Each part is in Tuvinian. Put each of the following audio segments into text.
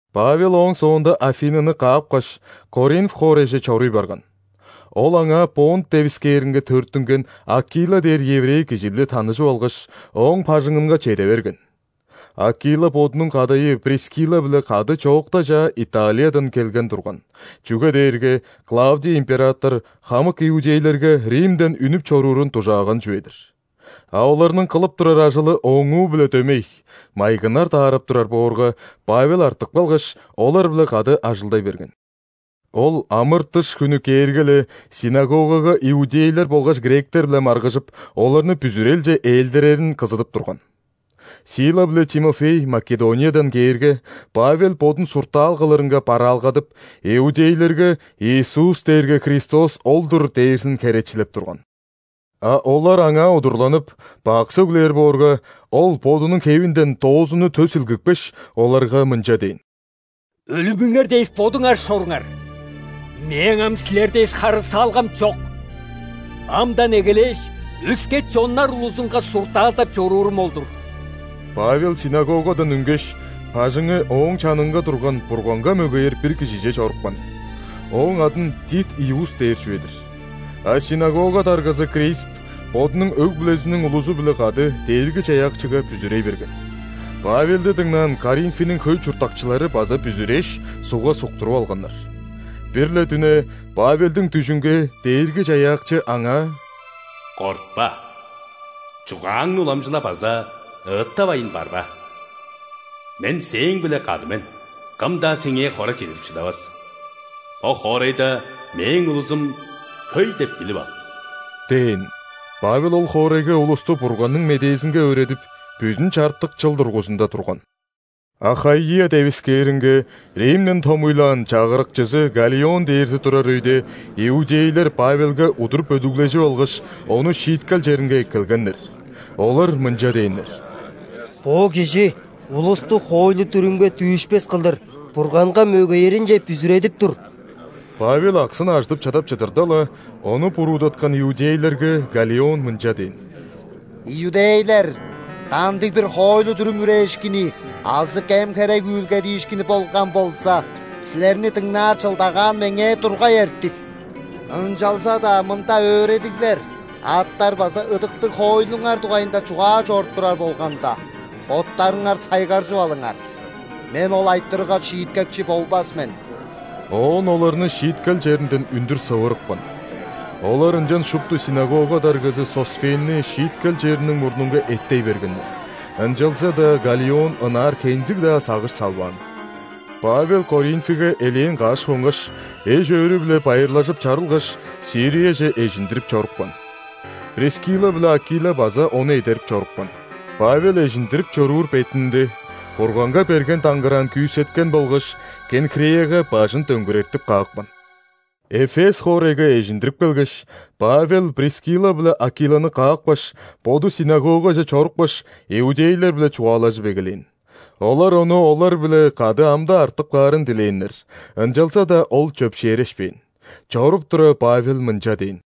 Павел ооң соонда Афиныны каапкаш, Коринф хоорайже чоруй барган. Ол аңаа Понт девискээринге төрүттүнген Акила дээр еврей кижи-биле таныжып алгаш, ооң бажыңынга чеде берген. Акила бодунуң кадайы Прискилла-биле кады чоокта чаа Италиядан келген турган, чүге дээрге Клавдий император хамык иудейлерге Римден үнүп чоруурун дужааган чүве-дир. А оларның кылып турар ажылы ооңуу-биле дөмей – майгыннар даарап турар боорга, Павел артып калгаш, олар-биле кады ажылдай берген. Ол ·амыр-дыш хүнү кээрге-ле, ·синагогага иудейлер болгаш гректер-биле маргыжып, оларны бүзүрелче ээлдирерин кызыдып турган. Сила биле Тимофей Македониядан кээрге, Павел бодун суртаал кылырынга бараалгадып, иудейлерге «Иисус дээрге Христос ол-дур» дээрзин херечилеп турган. А олар аңаа удурланып, бак сөглээр боорга, ол бодунуң хевинден доозунну тө силгипкеш, оларга мынча дээн: «Өлүмүңер дээш бодуңар шоруңар! Мээң ам силер дээш, харыысалгам чок. Амдан эгелээш, өске чоннар улузунга суртаалдап чоруурум ол-дур». Павел ·синагогадан үнгеш, бажыңы ооң чанынга турган Бурганга мөгеер бир кижиже чорупкан. Ооң адын Тит Иуст дээр чүве-дир. А синагога даргазы Крисп бодунуң өг-бүлезиниң улузу-биле кады Дээрги-Чаяакчыга бүзүрей берген. Павелди дыңнаан Коринфиниң хөй чурттакчылары база бүзүрээш, ·сугга суктуруп алганнар. Бир-ле дүне Павелдиң дүжүнге Дээрги-Чаяакчы аңаа: «Кортпа! Чугааңны уламчыла база ыыттавайн барба. Мен сээң-биле кады мен, кым-даа сеңээ хора чедирип шыдавас. Бо хоорайда Мээң улузум хөй деп билип ал» – дээн. Павел ол хоорайга улусту Бурганның медээзинге өөредип, бүдүн чартык чыл дургузунда турган. Ахаия девискээринге Римден томуйлаан чагырыкчызы Галлион дээрзи турар өйде, иудейлер Павелге удур бөлүглежип алгаш, ону шииткел черинге эккелгеннер. Олар мынча дээннер: «Бо кижи улусту хоойлу-дүрүмге дүүшпес кылдыр Бурганга мөгееринче бүзүредип тур». Павел аксын ажыдып чадап чыдырда-ла, ону буруудаткан иудейлерге Галлион мынча дээн: «Иудейлер, кандыг-бир хоойлу-дүрүм үрээшкини азы кем-херек үүлгедиишкини болган болза, силерни дыңнаар чылдагаан меңээ тургай эртик. Ынчалза-даа мында өөредиглер, аттар база ыдыктыг хоойлуңар дугайында чугаа чоруп турар болганда, боттарыңар сайгаржып алыңар. Мен ол айтырыгга шииткекчи болбас мен». Оон оларны шииткел черинден үндүр сывырыпкан. Олар ынчан шупту ·синагога даргазы Сосфенни шииткел чериниң мурнунга эттей бергеннер, ынчалза-даа Галлион ынаар хензиг-даа сагыш салбаан. Павел Коринфиге элээн каш хонгаш, эш-өөрү-биле байырлажып чарылгаш, Сирияже эжиндирип чорупкан. Прискилла биле Акила база ону эдерип чорупкан. Павел эжиндирип чоруур бетинде, Бурганга берген даңгыраан күүсеткен болгаш, Кенхреяга бажын дөңгүрертип каапкан. Эфес хоорайга эжиндирип келгеш, Павел Прискилла биле Акиланы каапкаш, боду ·синагогаже чорупкаш, иудейлер-биле чугаалажып эгелээн. Олар ону олар-биле кады ам-даа артып каарын дилээннер, ынчалза-даа ол чөпшээрешпээн. Чоруп тура, Павел мынча дээн: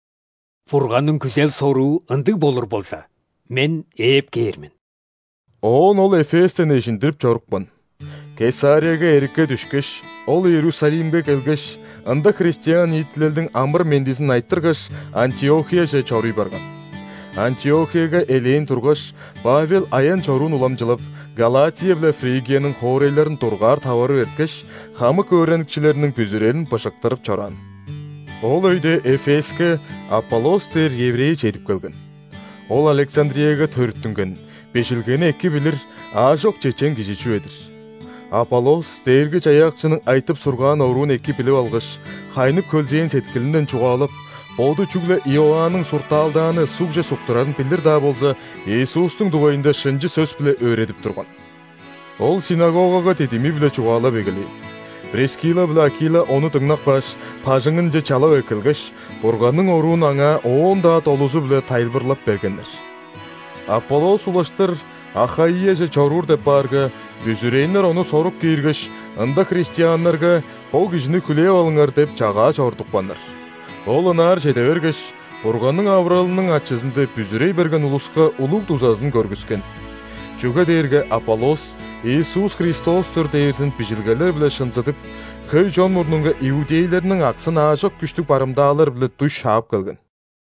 «Бурганның күзел-соруу ындыг болур болза, мен ээп кээр мен». Оон ол Эфестен эжиндирип чорупкан. Кесарияга эрикке дүшкеш, ол Иерусалимге келгеш, ында христиан ниитилелдиң амыр-мендизин айтыргаш, Антиохияже чоруй барган. Антиохияга элээн тургаш, Павел аян-чоруун уламчылап, Галатия биле Фригияның хоорайларын дургаар таварып эрткеш, хамык өөреникчилерниң бүзүрелин быжыктырып чораан. Ол өйде Эфеске Аполлос дээр еврей чедип келген. Ол Александрияга төрүттүнген, Бижилгени эки билир, аажок чечен кижи чүве-дир. Аполлос Дээрги-Чаяакчының айтып-сургаан оруун эки билип алгаш, хайнып-хөлзээн сеткилинден чугаалап, боду чүгле Иоанның суртаалдааны ·сугже суктурарын билир-даа болза, Иисустуң дугайында шынчы сөс-биле өөредип турган. Ол ·синагогага дидими-биле чугаалап эгелээн. Прискилла биле Акила ону дыңнап кааш, бажыңынче чалап эккелгеш, Бурганның оруун аңаа оон-даа долузу-биле тайылбырлап бергеннер. Аполлос улаштыр Ахаияже чоруур деп баарга, бүзүрээннер ону сорук кииргеш, ында христианнарга «Бо кижини хүлээп алыңар» деп чагаа чорудупканнар. Ол ынаар чеде бергеш, Бурганның авыралының ачызында бүзүрей берген улуска улуг дузазын көргүскен. Чүге дээрге Аполлос Иисус – Христос-тур дээрзин Бижилгелер-биле шынзыдып, хөй чон мурнунга иудейлерниң аксын аажок күштүг барымдаалар-биле дуй шаап келген.